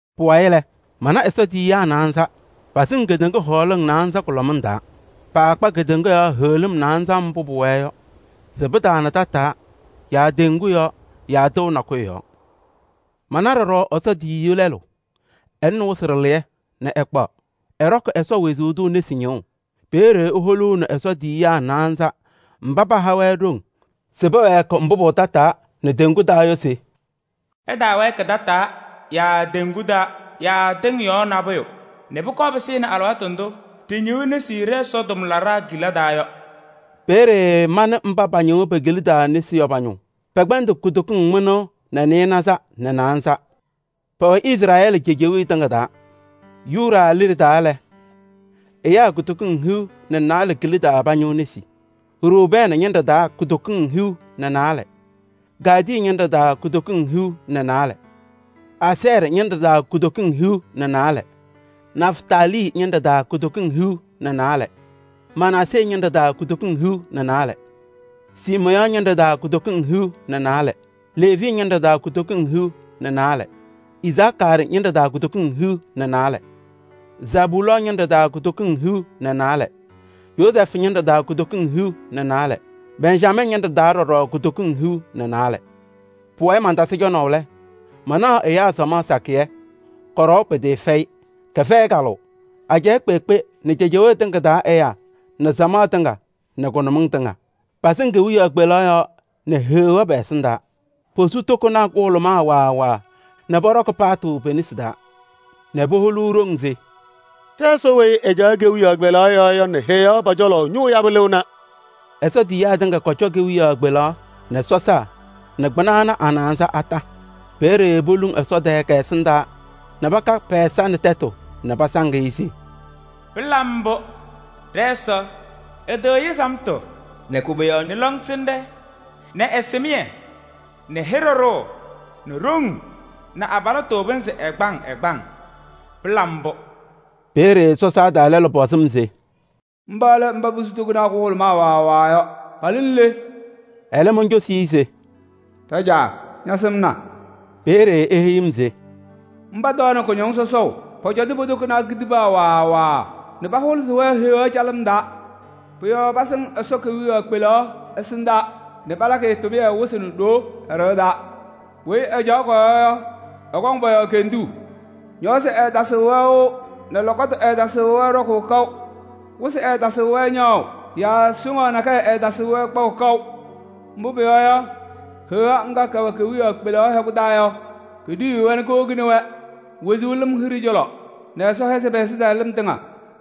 Pʋwayɩ lɛ, mana Ɛsɔ tiyiyaa naanza, pasɩŋ kedeŋa hɔɔlɩŋ naanza kʋlɔmɩŋ taa. Paakpa kedeŋa yɔɔ heɣlim naanza mbʋ pʋwɛɛ yɔ se pɩtaama tataa yaa teŋgu yɔɔ yaa tɩʋ nakʋyʋ yɔɔ. Mana ɖɔɖɔ Ɛsɔ tiyiyu lɛlʋ, ɛlɩnɩ wɩsɩ ɖɩlɩyɛ nɛ ɛkpaɣ. Ɛɖɔkɩ Ɛsɔ wezuu tʋ nesi ñɩɣʋ. Peeye eholuuni Ɛsɔ tiyiyaa naanza mba paha-wɛ ɖoŋ se pɛwɛɛkɩ mbʋ pʋwɛ tataa nɛ teŋgu taa yɔ se: “Ɩtaawɛɛkɩ tataa yaa teŋgu taa yaa tɩŋ yɔɔ nabʋyʋ nɛ pʋkɔɔ pɩsɩnɩ alɩwaatʋ ndʋ ɖɩñɩɣ nesi ɖɛ-Ɛsɔ tʋmlaɖaa kila taa yɔ.” Peeye manɩ mba pañɩɣ pe-kila taa nesi yɔ pa-ñʋʋ. Pɛkpɛndɩ kutokiŋ mɩnʋʋ nɛ nɩɩnaza nɛ naanza. Pɛwɛ Izrɛɛlɩ cejewee tɩŋa taa: Yuda liɖe taa lɛ, ɛyaa kutokiŋ hiu nɛ naalɛ kila taa pañɩɣ nesi. Rubɛɛnɩ ñɩnɖɛ taa kutokiŋ hiu nɛ naalɛ, Gaadɩ ñɩnɖɛ taa kutokiŋ hiu nɛ naalɛ. Asɛɛrɩ ñɩnɖɛ taa kutokiŋ hiu nɛ naalɛ, Nɛftalii ñɩnɖɛ taa kutokiŋ hiu nɛ naalɛ, Manaasee ñɩnɖɛ taa kutokiŋ hiu nɛ naalɛ. Siimeyɔɔ ñɩnɖɛ taa kutokiŋ hiu nɛ naalɛ, Leevi ñɩnɖɛ taa kutokiŋ hiu nɛ naalɛ, Isakaarɩ ñɩnɖɛ taa kutokiŋ hiu nɛ naalɛ. Zabulɔɔ ñɩnɖɛ taa kutokiŋ hiu nɛ naalɛ, Yozɛɛfʋ ñɩnɖɛ taa kutokiŋ hiu nɛ naalɛ, Bɛnjamɛɛ ñɩnɖɛ taa ɖɔɖɔ kutokiŋ hiu nɛ naalɛ. Pʋwayɩ mantasɩ cɔnaʋ lɛ, manaɣ ɛyaa samaɣ nakɛyɛ, kɔɖɔwa pɩtɩɩfɛyɩ, kɛfɛyɩ kalʋʋ: ajɛɛ kpeekpe nɛ cejewee tɩŋa taa ɛyaa nɛ samaɣ tɩŋa nɛ kʋnʋmɩŋ tɩŋa. Pasɩŋ kewiyaɣ kpelaɣ nɛ Heɣa pɛ-ɛsɩndaa. Posu tokonaa kʋhʋlʋmaa waa waa nɛ pɔɖɔkɩ paatʋ pe-nesi taa nɛ poholuu ɖoŋ se: “Ɖɛ-Ɛsɔ weyi ɛcaɣ kewiyaɣ kpelaɣ yɔɔ yɔ nɛ Heɣa pɔ-cɔlɔ ñʋʋ yabʋ lɩɣna!” Ɛsɔ tiyiyaa tɩŋa kɔcɔ kewiyaɣ kpelaɣ nɛ sɔsaa nɛ kpɩna ana a-naanza kondiko. Peeye poluŋ Ɛsɔ tɛɛ kɛ-ɛsɩndaa nɛ paka pɛ-ɛza nɛ tɛtʋ nɛ pasaŋ-ɩ se: “Pɩla mbʋ! Ɖɛ-Ɛsɔ ɛtɩɣyɩ samtʋ nɛ koboyaɣ nɛ lɔŋsɩnɖɛ nɛ ɛsɩmɩyɛ nɛ hɩɖɛ ɖʋʋ nɛ ɖoŋ nɛ abalɩtʋ pɩnzɩ ɛgbaŋ ɛgbaŋ! Pɩla mbʋ!” Peeye sɔsaa taa lɛlʋ pɔzɩ-m se: “Mba lɛ mba posu tokonaa kʋhʋlʋmaa waa waa yɔ. Palɩnɩ le?” Ɛlɛ moncosi-i se: “Ɖajaa! Ñasɩmna.” Peeye eheyi-m se: “Mba tɔɔnɩ kʋñɔŋ sɔsɔʋ. Pɔcɔtɩ po-tokonaa kitibaa waa waa nɛ pahʋlɩsɩ-wɛ Heɣa calɩm taa. Pʋ-yɔɔ pasɩŋ Ɛsɔ kewiyaɣ kpelaɣ ɛsɩndaa nɛ palakɩ-ɩ tʋmɩyɛ wɩsɩ nɛ ɖoo ɛ-ɖɩɣa taa. Weyi ɛcaɣ kɔ-yɔɔ yɔ, ɛkɔŋ pɔ-yɔɔ kenduu. Ñɔɔsɩ ɛɛtasɩɣ-wɛ wɩʋ nɛ lɔkɔtʋ ɛɛtasɩɣ-wɛ ɖɔkʋʋ kaʋ. Wɩsɩ ɛɛtasɩɣ-wɛ ñaɣʋ yaa soŋaɣ nakɛyɛ ɛɛtasɩɣ-wɛ kpaʋ kaʋ. Mbʋ pʋyɔɔ yɔ, Heɣa ŋga kɛwɛ kewiyaɣ kpelaɣ hɛkʋ taa yɔ, keɖiyiɣ-wɛ nɛ kowoni-wɛ wezuu lɩm hiɖe cɔlɔ nɛ Ɛsɔ hɛzɩ pɛ-ɛzɩtɛɣlɩm tɩŋa.”